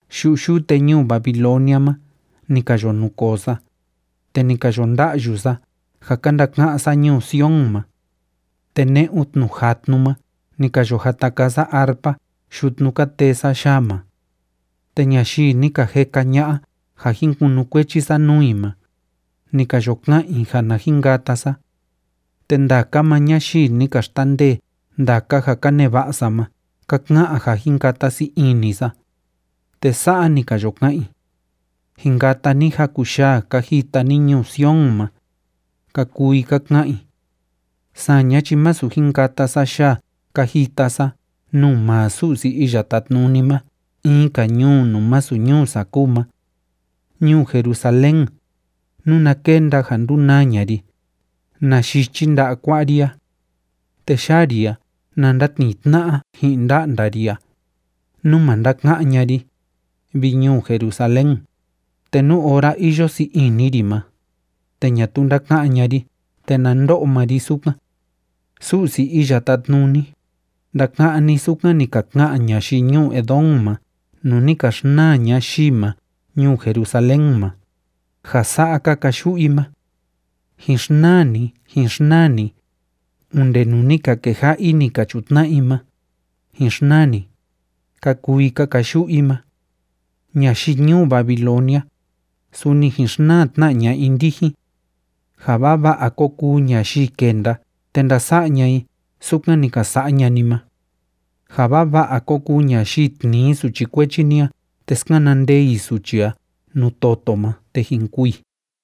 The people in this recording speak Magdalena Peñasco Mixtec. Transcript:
Yu'u yute ñuu Babilonia ma ni ka yo nukoo sa, te ni ka yo nda'yu sa ja ka ndaka'án sa ñuu Sion ma. Te ne'un tnu jatnu ma ni ka yo jata kaa sa arpa yutnu ka tee sa yaa ma. Te ñayii ni ka jeka ña'a ja jin kunukuechi sa nuu i ma, ni ka yo ka'an i ja na jin kata sa. Te ndaka maa ñayii ni ka xtandee ndaka ja ka neva'a sa ma ka ka'an ja jin kata sii ini sa, te sa'a ni ka yo ka'an i: “Jin kata ni jaku yaa ka jita ni ñuu Sion ma”, ka kuu i ka ka'an i. Saña chi masu jin kata sa yaa ka jita sa nuu maa Su'si Iya Tátnuni ma in‑ka ñuu nuu masu ñuu sa kúu ma. Ñuu Jerusalén, nuna kenda ja ndunaa ña'a ri, na yichi nda'a kua'a ri a. Te yaa ri a na ndatnii tna'a ji'in nda'nda ri a, nú ma ndaka'án ña'a ri, vi ñuu Jerusalén, te nú ora iyo sii ini ri ma, te ñatuu ndaka'án ña'a ri te na ndo'o maa ri sukan. Su'si Iya Tátnuni, ndaka'án ni sukan ni ka ka'an ñayii ñuu Edom ma nuu ni ka xnaa ñayii ma ñuu Jerusalén ma, ja sa'a ka kayu'u i ma: “Jin xnaa ni, jin xnaa ni, onde nuu ni ka keja'a i ni ka chutna'a i ma, jin xnaa ni”, ka kuu i ka kayu'u i ma. Ñayii ñuu Babilonia, suni jin xnaa tna ña'a i ndijin. Ja vava'a kó kuu ñayii kenda te ndasa'a ña'a i sukan ni ka sa'a ña'a ni ma. Ja vava'a kó kuu ñayii tnii suchi kuechi ni a te skana ndee i suchi a nuu toto ma te jin kûu i.